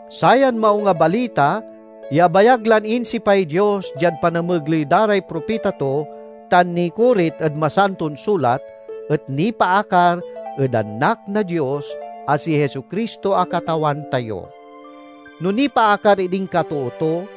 Sayan Maung a Balita ya abayag lan insipay Dios diad panamegley da ray propita to tan nikorit ed Masanton Sulat, et nipaakar ed Anak na Dios a si Jesu-Cristo a Katawan tayo. No nipaakar ed inkatoo to,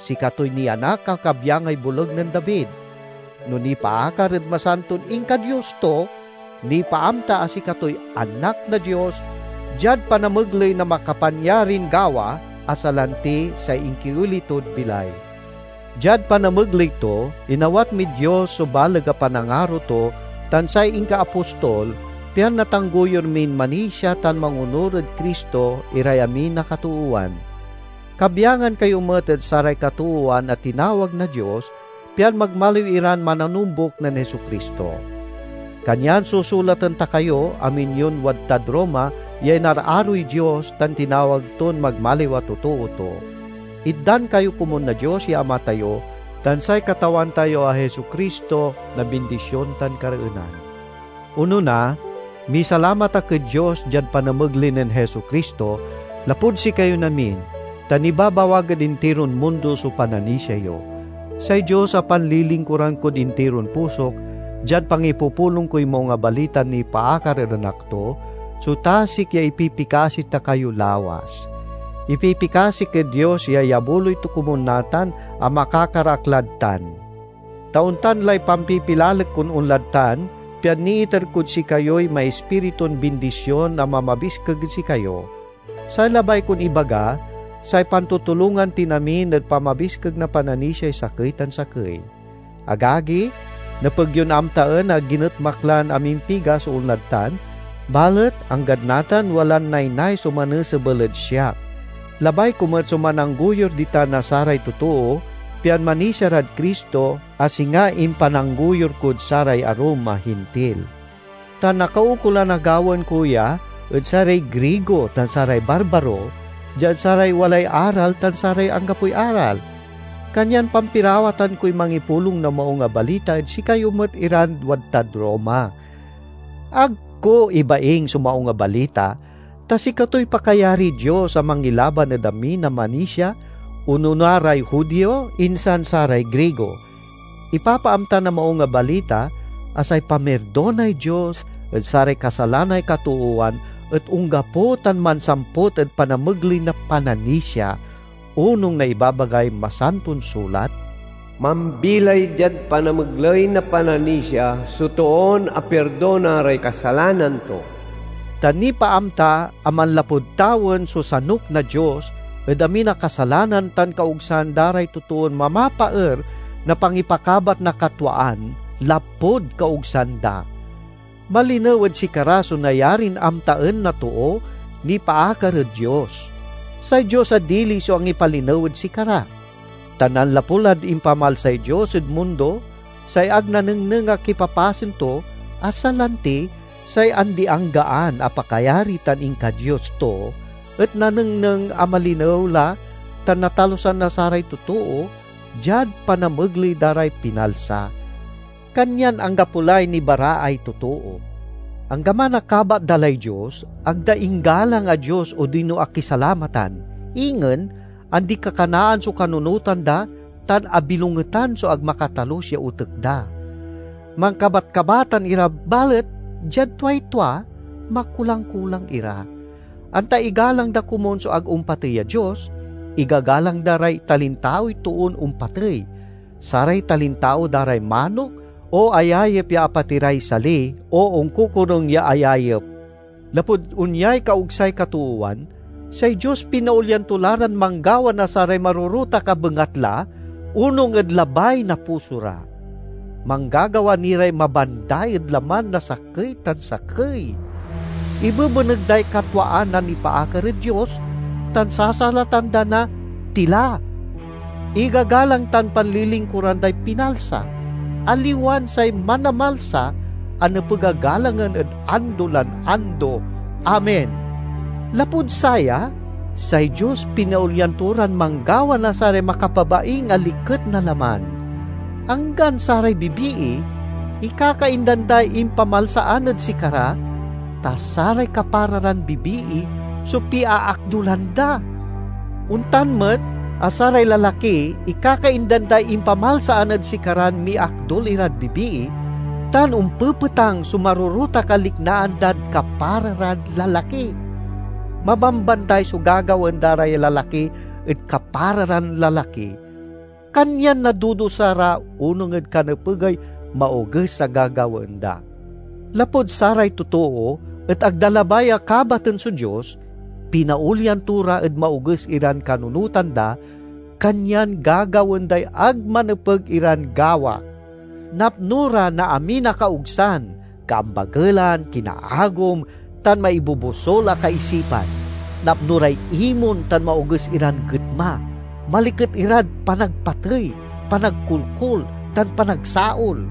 sikatoy nianak a kabyangay boleg nen David; no nipaakar ed masanton inka-Dios to, nipaamta a sikatoy Anak na Dios diad panamegley na makapanyarin gawa, a salanti say inkioli tod bilay. Diad panamegley to, inawat mid Dios so baleg a panangaro to tan say inkaapostol, pian natanggoyur min manisia tan mangonur ed Cristo iray amin a katoowan. Kabyangan kayo met ed saray katoowan a tinawag na Dios, pian magmaliw iran mananombuk nen Jesu-Cristo. Kanyan susulaten ta kayo, amin yon wadtad Roma ya inararoy Dios tan tinawag ton magmaliw a totoo to: Itdan kayo komun na Dios ya Ama tayo tan say Katawan tayo a Jesu-Cristo na bindision tan kareenan. Onona, misalamat ak ed Dios diad panamegley nen Jesu-Cristo, lapud sikayon amin; ta nibabawag ed intiron mundo so pananisia yo. Say Dios, a panlilingkuran kod intiron pusok diad pangipupulong koy Maung a Balitan nipaakar ed Anak to, so tasik ya ipipikasi ta kayo lawas. Ipipikasik ed Dios ya iyabuloy to komun natan a makakar ak lad tan. Ta ontan lay pampipilalek kon onlad tan, pian niiter kod sikayoy maispiritun bindision a mamabiskeg ed sikayo. Say labay kon ibaga, say pantutulongan tin amin ed pamabiskeg na pananisiay sakey tan sakey. Agagi, nepeg yon amtaen a ginetmak lan amimpiga so onlad tan, balet anggad natan walan naynay so manesebel ed siak. Labay ko met so mananggoyur ditan na saray totoo pian manisia rad Cristo, a singa impananggoyur kod saray arum a Hintil. Ta nakaukolan a gawaen ko ya ed saray Grigo tan saray barbaro, diad saray walay-aral tan saray anggapoy-aral. Kanyan pampirawatan koy mangipulong na Maung a Balita ed sikayo met iran wadtad Roma. Ag ko ibaing so Maung a Balita, ta sikatoy pakayariy Dios a mangilaban ed amin a manisia, onona ray Judio, insan saray Grigo. Ipapaamta na Maung a Balita a say pamirdonay Dios ed saray kasalanay katoowan et onggapo tan mansamput ed panamegley na pananisia. Onung na ibabagay Masanton Sulat, "Mambilay diad panamegley na pananisia so toon apirdona ray kasalanan to." Ta nipaamta a manlapud tawen so sanuk na Dios ed amin a kasalanan tan kaogsan da ray totoon mamapaer na pangipakabat na katwaan, lapud kaogsan da. Malinew ed sikara so nayarin amtaen na too nipaakar ed Dios. Say Dios a dili so angipalinew ed sikara. Ta nanlapu lad impamalsay Dios ed mundo say ag nanengneng a kipapasen to, a salanti say andi-anggaan a pakayari tan inka-Dios to, et nanengneng a malinew la tan natalusan na saray totoo diad panamegley da ray pinalsa. Kanyan anggapo lay nibaraay totoo! Anggaman a kabat da lay Dios, ag da inggalang a Dios odino akisalamatan. Ingen, andikakanaan so kanunotan da tan abilongetan so ag makatalus ya otek da. Mankabatkabatan ira balet diad tuay tua, makulang-kulang ira. Anta igalang da komun so ag ompatey a Dios, igagalang da ray talintaoy toon ompatey, saray talintao da ray manok, o ayayep ya apatiray sali, o onkokorung ya ayayep. Lapud onyay kaogsay katoowan, say Dios pinaolyan to la ran manggawa na saray marorotak a bengatla onung ed labay na puso ra. Manggagawa ni ray mabanday ed laman na sakey tan sakey. Ibebeneg day katwaan a nipaakar ed Dios tan sasalatan da na tila. Igagalang tan panlilingkuran day pinalsa, aliwan say Manamalsa a nepeg a galangen ed ando lan ando! Amen. Lapud saya, say Dios pinaolyan to ran manggawa na saray makapabaing a liket na laman. Anggan saray bibii ikakaindan day impamalsaan ed sikara, ta saray kapara ran bibii so piaakdulan da. Ontan met a saray lalaki ikakaindan day impamalsaan ed sikaran miakdul irad bibii, tan ompepetang so marorotak a liknaan dad kapara ran lalaki. Mabambanday so gagawaen da ray lalaki ed kapara ran lalaki, kanyan nadudusa ra onung ed kanepegay maoges a gagawaen da. Lapud saray totoo et ag da labay a kabaten so Dios, pinaolyan to ra ed maoges iran kanunotan da, kanyan gagawaen day ag manepeg iran gawa. Napno ra na amin a kaogsan, kaambagelan, kinaagom tan maibobosul a kaisipan; napno ray imon tan maoges iran getma; maliket irad panagpatey, panagkolkol, tan panagsaol.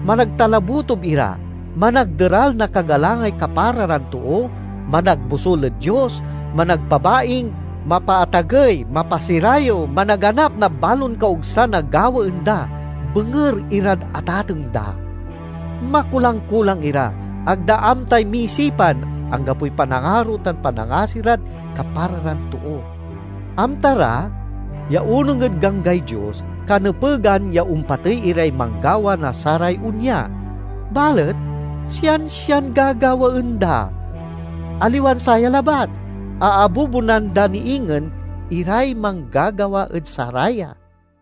Managtalabotob ira, managderal na kagalangay kapara ran too, managbosul ed Dios, managpabaing, mapaatagey, mapasirayew, managanap na balon kaogsan a gawaen da, benger irad atateng da. Makulang-kulang ira, ag da amtay misipan, anggapoy panangaro tan panangasi rad kapara ran too. Amta ra, ya onung ed ganggay Dios, kanepegan ya ompatey iray manggawa na saray onya, balet siansian gagawaen da. Aliwan saya labat, aabubunan da ni ingen iray manggagawa ed saraya.